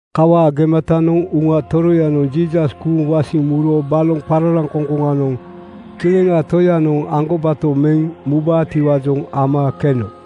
Kawaa gematanoŋ Uŋa Toroyanoŋ Jiisas kuuŋ wasiŋ muro baloŋ qararaŋkoŋkoŋanoŋ Kileŋaa Toyanoŋ aŋgobato meŋ mubaatiwaajoŋ ama keno.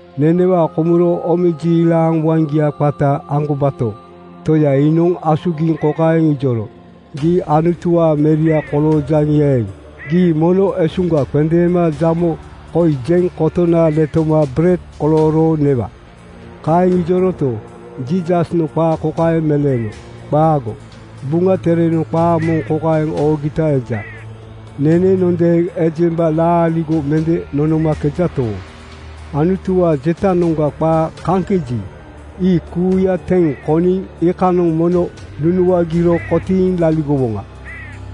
Nenewaa komuro omejiilaŋ waŋgia qata aŋgobato Toya iinoŋ asugiŋ kokaeŋ ijoro, “Gii Anutuwaa Meria koloojaŋi eeŋ, gii mono esuŋga qendeema jamo koi jeŋ kotona letoma bered kolooro newa.” Kaeŋ ijoroto, Jiisasnoŋ qaa kokaeŋ meleeno, “Qaago! Buŋa Terenoŋ qaa moŋ kokaeŋ oogita eja, ‘Nenenondeeŋ ejemba laaligo mende nonomakejato, Anutuwaa jetanoŋga qaa kaŋkeji, ii kuuya teŋ koniŋ iikanoŋ mono nunuagiro kotiiŋ laligowoŋa’.”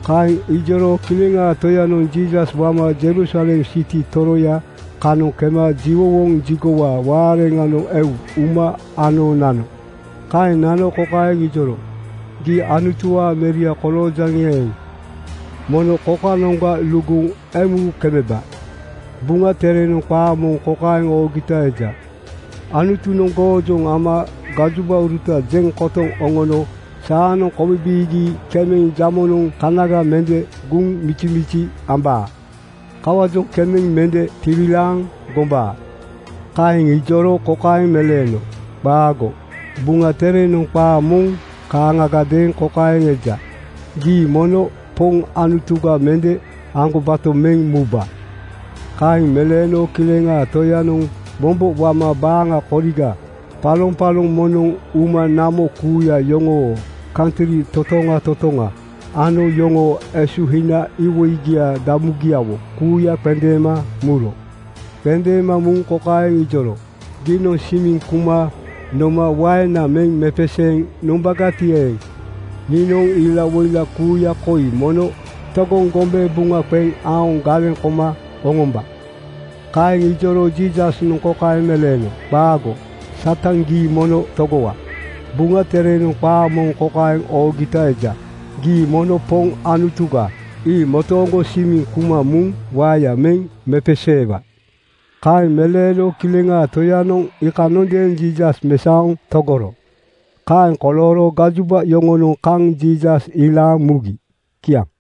Kaeŋ ijoro Kileŋaa Toyanoŋ Jiisas wama Jerusalem siti toroya kanoŋ kema jiwowoŋ jigowaa waareŋanoŋ eu uma ano nano. Kaeŋ nano kokaeŋ ijoro, “Gii Anutuwaa Meria koloojaŋi eeŋ, mono kokanoŋga luguŋ emu kemeba. Buŋa Terenoŋ qaa moŋ kokaeŋ oogita eja, ‘Anutunoŋ goojoŋ ama gajobauruta jeŋ kotoŋ oŋono saanoŋ kobibiigi kemeŋ jamonoŋ kanaga mende guŋ mijimiji ambaa.’ Kawaajoŋ kemeŋ mende tiwilaaŋ gombaa.” Kaeŋ ijoro kokaeŋ meleeno, “Qaago! Buŋa Terenoŋ qaa moŋ kaaŋagadeeŋ kokaeŋ eja, ‘Gii mono Poŋ Anutuga mende aŋgobato meŋ muba.” ’ Kaeŋ meleeno Kileŋaa Toyanoŋ mombo wama baaŋa koriga paloŋpaloŋ moŋnoŋ uma namo kuuya yoŋoo kantri totoŋa totoŋa ano yoŋoo esuhina iwoigia damugiawo kuuya qendeema muro. Qendeema muŋ kokaeŋ ijoro, “Giinoŋ simiŋ kuma noma waena meŋ mepeseeŋ nombagati eeŋ, niinoŋ ilawoila kuuya koi mono togoŋ gombe buŋa qeŋ aoŋ galeŋ koma oŋomba.” Kaeŋ ijoro Jiisasnoŋ kokaeŋ meleeno, “Qaago! Satan gii mono togowa. Buŋa Terenoŋ qaa moŋ kokaeŋ oogita eja, ‘Gii mono Poŋ Anutuga, ii motooŋgo simiŋ kuma muŋ waeya meŋ mepeseewa.” ’ Kaeŋ meleeno Kileŋaa Toyanoŋ iikanondeeŋ Jiisas mesaoŋ togoro. Kaeŋ kolooro gajoba yoŋonoŋ kaŋ Jiisas ilaaŋ mugi. Kiaŋ.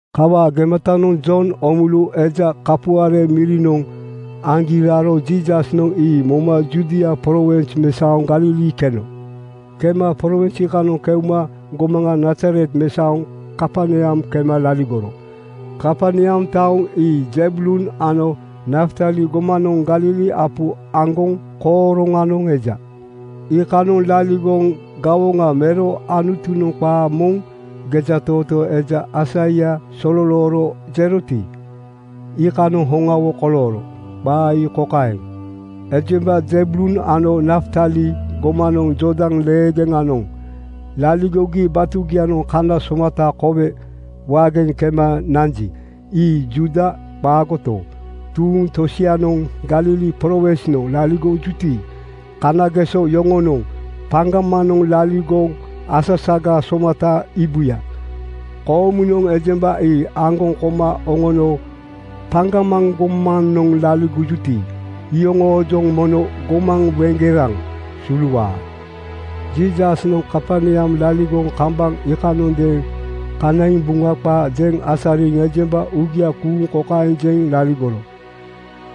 Kawaa gematanoŋ Jon Oomulu eja kapuare mirinoŋ aŋgi raro Jiisasnoŋ ii moma Judia prowins mesaoŋ Galili keno. Kema prowins iikanoŋ keuma gomaŋa Nazaret mesaoŋ Kaperneam kema laligoro. Kaperneam taoŋ ii Zebulun ano Naftali gomanoŋ Galili apu aŋgoŋ kooroŋanoŋ eja. Iikanoŋ laligoŋ gawoŋa mero Anutunoŋ qaa moŋ gejatootoo eja Aisaia sololooro jeroti, iikanoŋ hoŋawo kolooro. Qaa ii kokaeŋ, “Ejemba Zebulun ano Naftali gomanoŋ Jordan leegeŋanoŋ laligogi batugianoŋ kana somata kowe waageŋ kema nanji, ii Juuda qaagoto, tuuŋ tosianoŋ Galili prowinsnoŋ laligojuti, kanageso yoŋonoŋ paŋgamanoŋ laligoŋ asasaga somata iibuya. Koomunoŋ ejemba ii aŋgoŋ koma oŋono paŋgamaŋ gomanoŋ laligojuti, iyoŋoojoŋ mono gomaŋ weŋgeraŋ suluwaa.” Jiisasnoŋ Kaperneam laligoŋ kambaŋ iikanondeeŋ kanaiŋ Buŋa qaa jeŋ asariŋ ejemba uugia kuuŋ kokaeŋ jeŋ laligoro,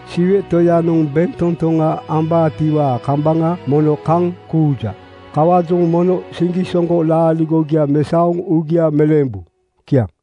“Siwe Toyanoŋ bentotoŋa ambaatiwaa kambaŋa mono kaŋ kuuja. Kawaajoŋ mono siŋgisoŋgo laaligogia mesaoŋ uugia meleembu.” Kiaŋ.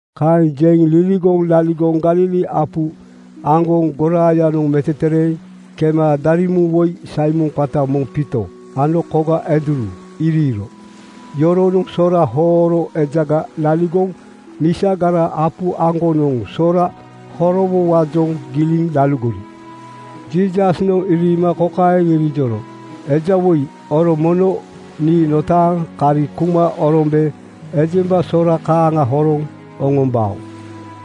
Kaeŋ jeŋ liligoŋ laligoŋ Galili apu aŋgoŋ goraayanoŋ metetereeŋ kema daremuŋ woi Saimon qata moŋ Piito ano koga Andruu iriiro. Yoronoŋ sora hooro ejaga laligoŋ misagara apu aŋgonoŋ sora horowowaajoŋ giliŋ laligori. Jiisasnoŋ iriima kokaeŋ irijoro, “Ejawoi, oro mono nii notaaŋ kari kuma orombe ejemba sora kaaŋa horoŋ oŋombao.”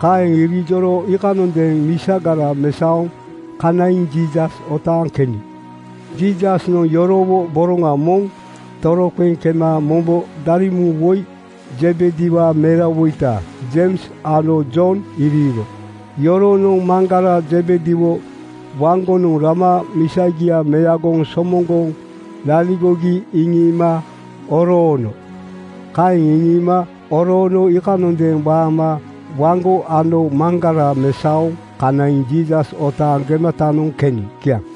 Kaeŋ irijoro iikanondeeŋ misagara mesaoŋ kanaiŋ Jiisas otaaŋ keni. Jiisasnoŋ yorowo boroŋa moŋ toroqeŋ kema mombo daremuŋ woi Zebediwaa merawoita Jeims ano Jon iriiro. Yoronoŋ maŋgara Zebediwo waŋgonoŋ rama misagia meagoŋ somoŋgoŋ laligogi iŋiima oroono. Kaeŋ iŋiima oroono iikanondeeŋ waama waŋgo ano maŋgara mesaoŋ kanaiŋ Jiisas otaaŋ gematanoŋ keni. Kiaŋ.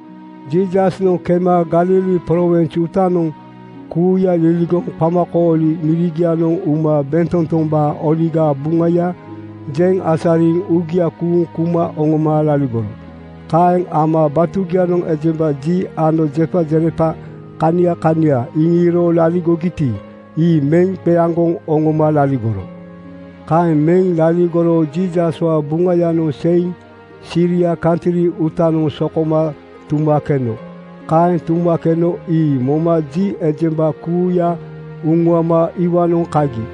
Jiisasnoŋ kema Galili prowins uutanoŋ kuuya liligoŋ qamakooli mirigianoŋ uma bentotombaa Oligaa Buŋaya jeŋ asariŋ uugia kuuŋ kuma oŋoma laligoro. Kaeŋ ama batugianoŋ ejemba ji ano jepajerepa kania kania iŋiro laligogiti, ii meŋ qeaŋgoŋ oŋoma laligoro. Kaeŋ meŋ laligoro Jiisaswaa Buŋayanoŋ seiŋ Siria kantri uutanoŋ sokoma tuma keno. Kaeŋ tuma keno ii moma ji ejemba kuuya uŋuama iwaanoŋ kagi.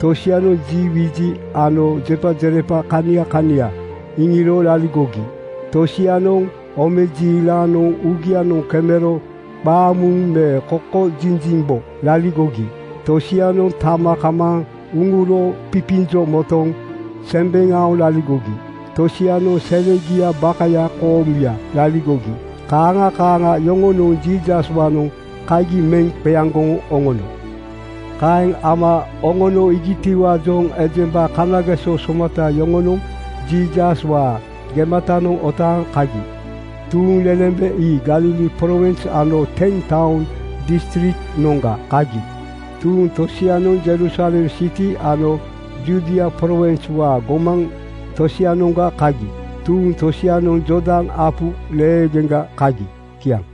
Tosianoŋ ji wiji ano jepajerepa kania kania iŋiro laligogi. Tosianoŋ omejiilanoŋ uugianoŋ kemero qaamuuŋ me kokojinjimbo laligogi. Tosianoŋ tama kamaaŋ uŋuro pipinjo motoŋ sembeŋ aoŋ laligogi. Tosianoŋ selegiaa bakaya koomuya laligogi. Kaaŋa kaaŋa yoŋonoŋ Jiisaswaanoŋ kagi meŋ qeaŋgoŋ oŋono. Kaeŋ ama oŋono iigitiwaajoŋ ejemba kanageso somata yoŋonoŋ Jiisaswaa gematanoŋ otaaŋ kagi. Tuuŋlelembe ii Galili prowins ano Ten-Taoŋ distriknoŋga kagi. Tuuŋ tosianoŋ Jerusalem siti ano Judia prowinswaa gomaŋ tosianoŋga kagi. Tuuŋ tosianoŋ Jordan apu leegeŋga kagi. Kiaŋ.